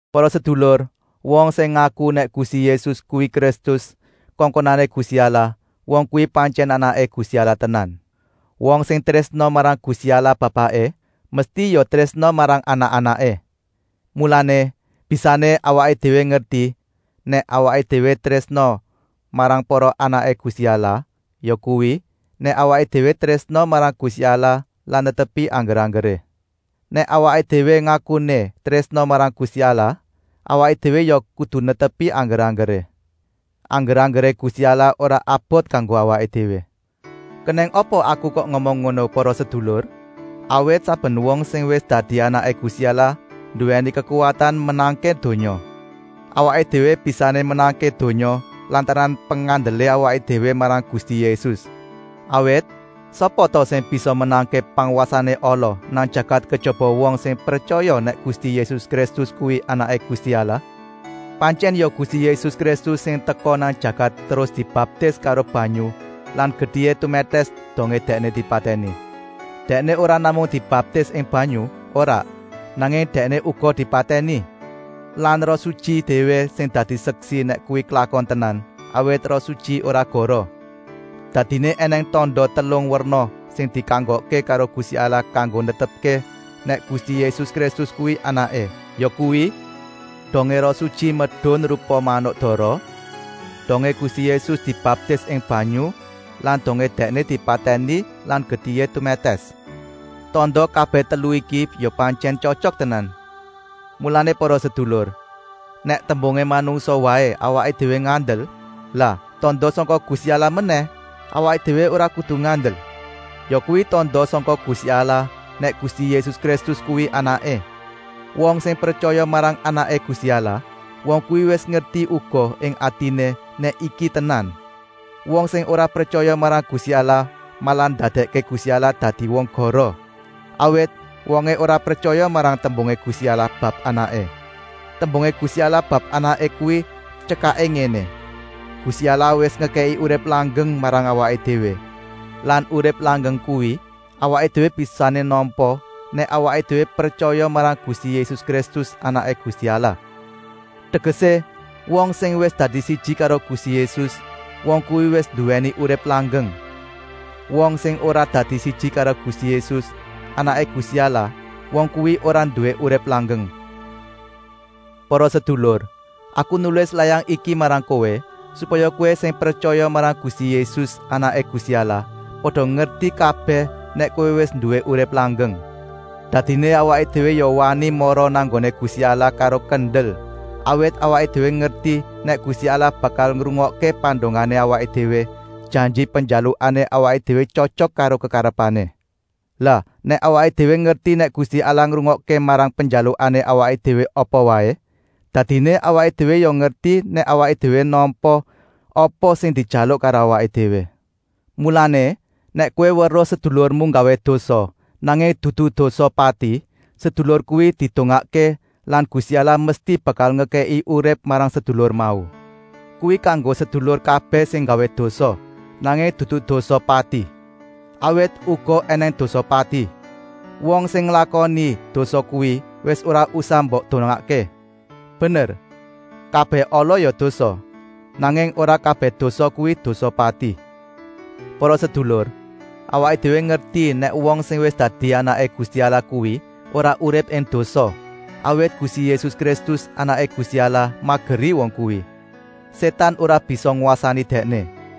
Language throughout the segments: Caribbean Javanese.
Para sedulur, wong sing ngaku nèk Gusti Yésus kuwi Kristus, kongkonané Gusti Allah, wong kuwi pantyèn anaké Gusti Allah tenan. Wong sing trésna marang Gusti Allah Bapaké, mesti ya trésna marang anak-anaké. Mulané, bisané awaké déwé ngerti, nèk awaké déwé trésna marang para anaké Gusti Allah yakuwi, nèk awaké déwé trésna marang Gusti Allah lan netepi angger-anggeré. Nèk awaké déwé ngakuné trésna marang Gusti Allah, awaké déwé ya kudu netepi angger-anggeré. Angger-anggeré Gusti Allah ora abot kanggo awaké déwé. Kenèng apa aku kok ngomong ngono, para sedulur? Awit saben wong sing wis dadi anaké Gusti Allah nduwèni kekuwatan menangké donya. Awaké déwé bisané menangké donya lantaran pengandelé awaké déwé marang Gusti Yésus. Awit, sapa ta sing bisa menangké pangwasané ala nang jagat kejaba wong sing pretyaya nèk Gusti Yésus Kristus kuwi Anaké Gusti Allah. Pantyèn ya Gusti Yésus Kristus sing teka nang jagat terus dibaptis karo banyu lan getihé tumètès dongé Dèkné dipatèni. Dèkné ora namung dibaptis ing banyu, ora, nanging Dèkné uga dipatèni. Lan Roh Sutyi déwé sing dadi seksi nèk kuwi klakon tenan, awit Roh Sutyi ora goroh. Dadiné ènèng tanda telung werna sing dikanggokké karo Gusti Allah kanggo netepké nèk Gusti Yésus Kristus kuwi Anaké, yakuwi: dongé Roh Sutyi medun rupa manuk dara, dongé Gusti Yésus dibaptis ing banyu lan dongé Dèkné dipatèni lan getihé tumètès. Tanda kabèh telu iki ya pantyèn tyotyok tenan. Mulané para sedulur, nèk tembungé manungsa waé awaké déwé ngandel, lah tanda sangka Gusti Allah menèh awaké déwé ora kudu ngandel? Yakuwi tanda sangka Gusti Allah nèk Gusti Yésus Kristus kuwi Anaké. Wong sing pretyaya marang Anaké Gusti Allah, wong kuwi wis ngerti uga ing atiné nèk iki tenan. Wong sing ora pretyaya marang Gusti Allah malah ndadèkké Gusti Allah dadi wong goroh, awit wongé ora pretyaya marang tembungé Gusti Allah bab Anaké. Tembungé Gusti Allah bab Anaké kuwi tyekaké ngéné: Gusti Allah wis ngekèki urip langgeng marang awaké déwé lan urip langgeng kuwi awaké déwé bisané nampa nèk awaké déwé pretyaya marang Gusti Yésus Kristus, Anaké Gusti Allah. Tegesé, wong sing wis dadi siji karo Gusti Yésus, wong kuwi wis nduwèni urip langgeng. Wong sing ora dadi siji karo Gusti Yésus, Anaké Gusti Allah, wong kuwi ora nduwé urip langgeng. Para sedulur, aku nulis layang iki marang kowé, supaya kowé sing pretyaya marang Gusti Yésus, Anaké Gusti Allah, pada ngerti kabèh nèk kowé wis nduwé urip langgeng. Dadiné awaké déwé ya wani mara nang nggoné Gusti Allah karo kendel, awit awaké déwé ngerti nèk Gusti Allah bakal ngrungokké pandongané awaké déwé, janji penjalukané awaké déwé tyotyok karo kekarepané. Lah nèk awaké déwé ngerti nèk Gusti Allah ngrungokké marang penjalukané awaké déwé apa waé, dadiné awaké déwé ya ngerti nèk awaké déwé nampa apa sing dijaluk karo awaké déwé. Mulané, nèk kowé weruh sedulurmu nggawé dosa, nanging dudu dosa pati, sedulur kuwi didongakké lan Gusti Allah mesti bakal ngekèki urip marang sedulur mau. Kuwi kanggo sedulur kabèh sing nggawé dosa, nanging dudu dosa pati. Awit uga ènèng dosa pati. Wong sing nglakoni dosa kuwi wis ora usah mbok dongaké. Bener, kabèh ala ya dosa, nanging ora kabèh dosa kuwi dosa pati. Para sedulur, awaké déwé ngerti nèk wong sing wis dadi anaké Gusti Allah kuwi ora urip ing dosa, awit Gusti Yésus Kristus, Anaké Gusti Allah, mageri wong kuwi. Sétan ora bisa ngwasani dèkné.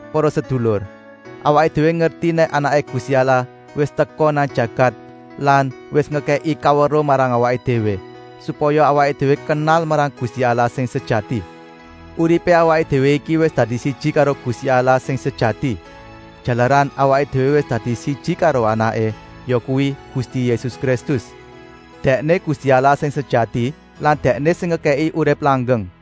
Para sedulur, awaké déwé ngerti nèk Anaké Gusti Allah wis teka nang jagat lan wis ngekèki kaweruh marang awaké déwé, supaya awaké déwé kenal marang Gusti Allah sing sejati. Uripé awaké déwé iki wis dadi siji karo Gusti Allah sing sejati, jalaran awaké déwé wis dadi siji karo Anaké, yakuwi Gusti Yésus Kristus. Dèkné Gusti Allah sing sejati lan Dèkné sing ngekèki urip langgeng.